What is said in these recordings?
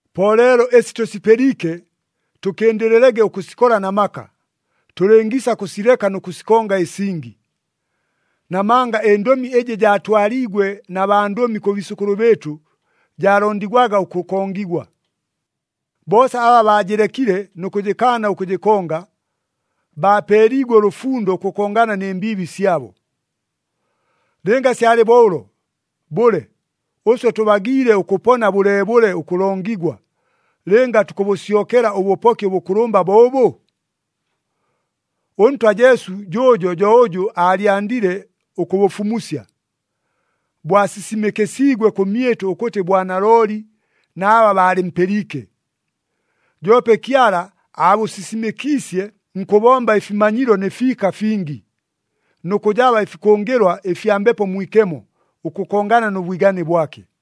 Po leelo ɨsi tʉsipɨliike, tʉkɨndɨlɨlege ʉkʉsikola na maka, tʉlɨngiisa kʉsileka nʉ kʉsikonga ɨsingi. Namanga ɨndʉmi ɨjɨ jaatwaliigwe na bandʉmi kʉ biisʉkʉlʉ bɨɨtʉ jaalondigwaga ʉkʉkongigwa. Boosa aba baajɨlekile nʉ kʉjɨkaana ʉkʉjɨkonga, baapeeliigwe ʉlʉfundo ʉkʉkongana nɨ mbiibi syabo. Lɨnga syalɨ bo ʉlo, bʉle, ʉswe tʉbagiile ʉkʉpona bʉleebʉle ʉkʉlongigwa, lɨnga tukʉbʉsyokela ʉbʉpoki ʉbʉkʉlʉmba bo ʉbʉ? ɄNtwa Jesu jʉʉjo jo ʉjʉ aalyandile ʉkʉbʉfumusya, bwasisimɨkɨsiigwe kʉmyɨtʉ ʉkʉtɨ bwanalooli na aba baalɨmpɨliike. Joope Kyala aabʉsisimɨkiisye nkʉbomba ɨfimanyilo nɨ fiika fingi, nʉ kʉjaba ɨfikʉngɨlwa ɨfya Mbepo Mwikemo ʉkʉkongana nʉ bwigane bwake.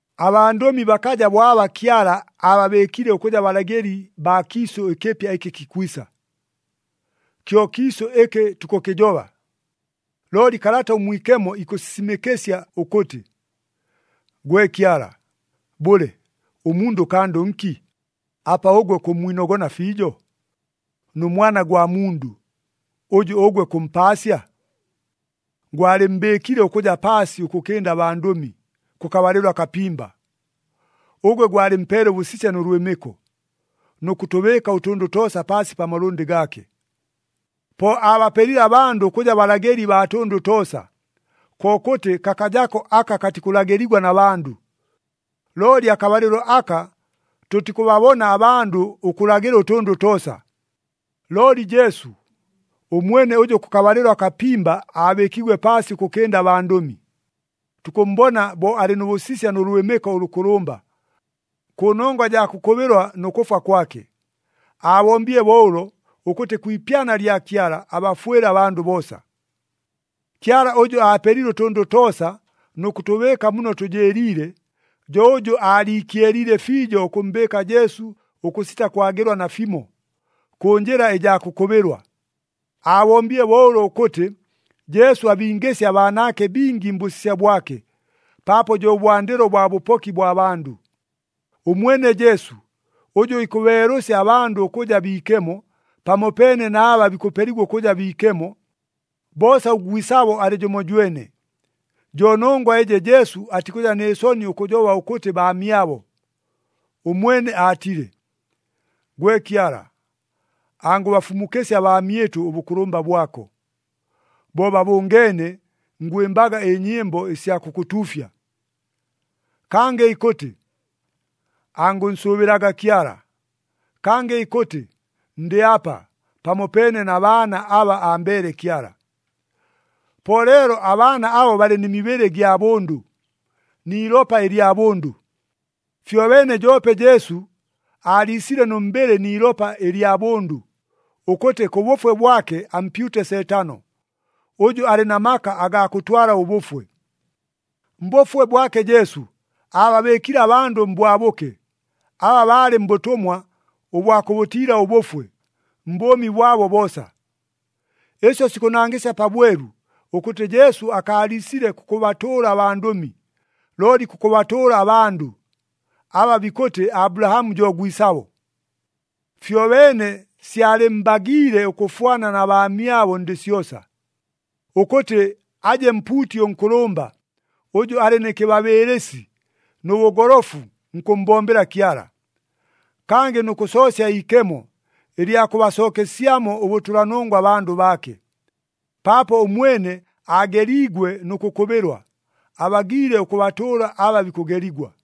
Abandʉmi bakaja bo aba Kyala ababɨɨkile ʉkʉja balagɨli baa kiisʉ ɨkɨpya ɨkɨ kikwisa. Kyo kiisʉ ɨkɨ tukʉkɨjoba. Looli Kalata ʉMwikemo ikʉsisimɨkɨsya ʉkʉtɨ, “Gwe Kyala, bʉle, ʉmundʉ kandʉ nki, apa ʉgwe kʉmmwinogona fiijo? Nʉ mwana gwa mundʉ, ʉjʉ ʉgwe kʉmpaasya? Gwalɨmmbɨɨkile ʉkʉja paasi ʉkʉkɨnda abandʉmi, kʉkabalɨlo akapimba. Ʉgwe gwalɨmpeele ʉbʉsisya nʉ lwɨmɨko, nʉ kʉtʉbɨɨka ʉtʉndʉ toosa paasi pa malʉndɨ gaake.” Po aabapelile abandʉ ʉkʉja balagɨli baa tʉndʉ toosa, kokʉtɨ kakajako aka katikʉlagɨligwa na bandʉ. Looli akabalɨlo aka tʉtikʉbabona abandʉ ʉkʉlagɨla ʉtʉndʉ toosa. Looli Jesu, ʉmwene ʉjʉ kʉkabalɨlo akapimba aabɨɨkiigwe paasi ʉkʉkɨnda abandʉmi, tukʉmmbona bo alɨ nʉ bʉsisya nʉ lwɨmɨko ʉlʉkʉlʉmba, kʉnongwa jaa kʉkʉbɨlwa nʉ kʉfwa kwake. Aabombile bo ʉlo, ʉkʉtɨ kwi ipyana lya Kyala, abafwɨle abandʉ boosa. Kyala ʉjʉ aapelile ʉtʉndʉ toosa nʉ kʉtʉbɨɨka muno tʉjɨɨliile, jo ʉjʉ aaliikyeliile fiijo ʉkʉmmbɨɨka Jesu ʉkʉsita kwagɨlwa nafimo, kʉ njɨla ɨjaa kʉkʉbɨlwa. Aabombile bo ʉlo ʉkʉtɨ, Jesu abingɨsye abaanaake bingi mbʉsisya bwake, paapo jo bwandɨlo bwa bʉpoki bwa bandʉ. Ʉmwene Jesu, ʉjʉ ikʉbeelʉsya abandʉ ʉkʉja biikemo, pamopeene na aba bikʉpeligwa ʉkʉja biikemo, boosa ʉgwisabo alɨ jʉmojwene. Jo nongwa ɨjɨ Jesu atikʉja nɨ soni ʉkʉjoba ʉkʉtɨ baamyabo. Ʉmwene aatile, “Gwe Kyala, angʉbafumukɨsya abaamyɨtʉ ʉbʉkʉlʉmba bwako. Bo babʉngeene, ngwɨmbaga ɨnyɨmbo ɨsya kʉkʉtuufya.” Kangɨ ikʉtɨ, “Angʉnsʉʉbɨlaga Kyala.” Kangɨ ikʉtɨ, “Ndɨ apa, pamopeene na baana aba ambeele Kyala.” Po leelo abaana abo balɨ nɨ mibɨlɨ ɨgya bʉndʉ, ni ilopa ɨlya bʉndʉ. Fyobeene joope Jesu aaliisile nʉ mbɨlɨ ni ilopa ɨlya bʉndʉ, ʉkʉtɨ kʉ bʉfwe bwake ampyute Seetano, ʉjʉ alɨ na maka agaa kʉtwala ʉbʉfwe. Mbʉfwe bwake Jesu, aababɨɨkile abandʉ mbwabʉke, aba baalɨ mbʉtʉmwa ʉbwa kʉbʉtiila ʉbʉfwe, mbʉʉmi bwabo boosa. Ɨsyo sikʉnangɨsya pabwelu, ʉkʉtɨ Jesu akaaliisile kʉkʉbatʉʉla abandʉmi, looli kʉkʉbatʉʉla abandʉ, aba bikʉtɨ Abulahamu jo gwisabo. Fyobeene syalɨmmbagiile ʉkʉfwana na baamyabo ndɨ syosa, ʉkʉtɨ aje mpuuti ʉnkʉlʉmba, ʉjʉ alɨ nɨ kɨbabɨɨlɨsi nʉ bʉgolofu nkʉmmbombela Kyala. Kangɨ nʉ kʉsoosya iikemo, ɨlya kʉbasookesyamo ʉbʉtʉlanongwa abandʉ baake. Paapo ʉmwene aageliigwe nʉ kʉkʉbɨlwa, abagiile ʉkʉbatʉʉla aba bikʉgeligwa.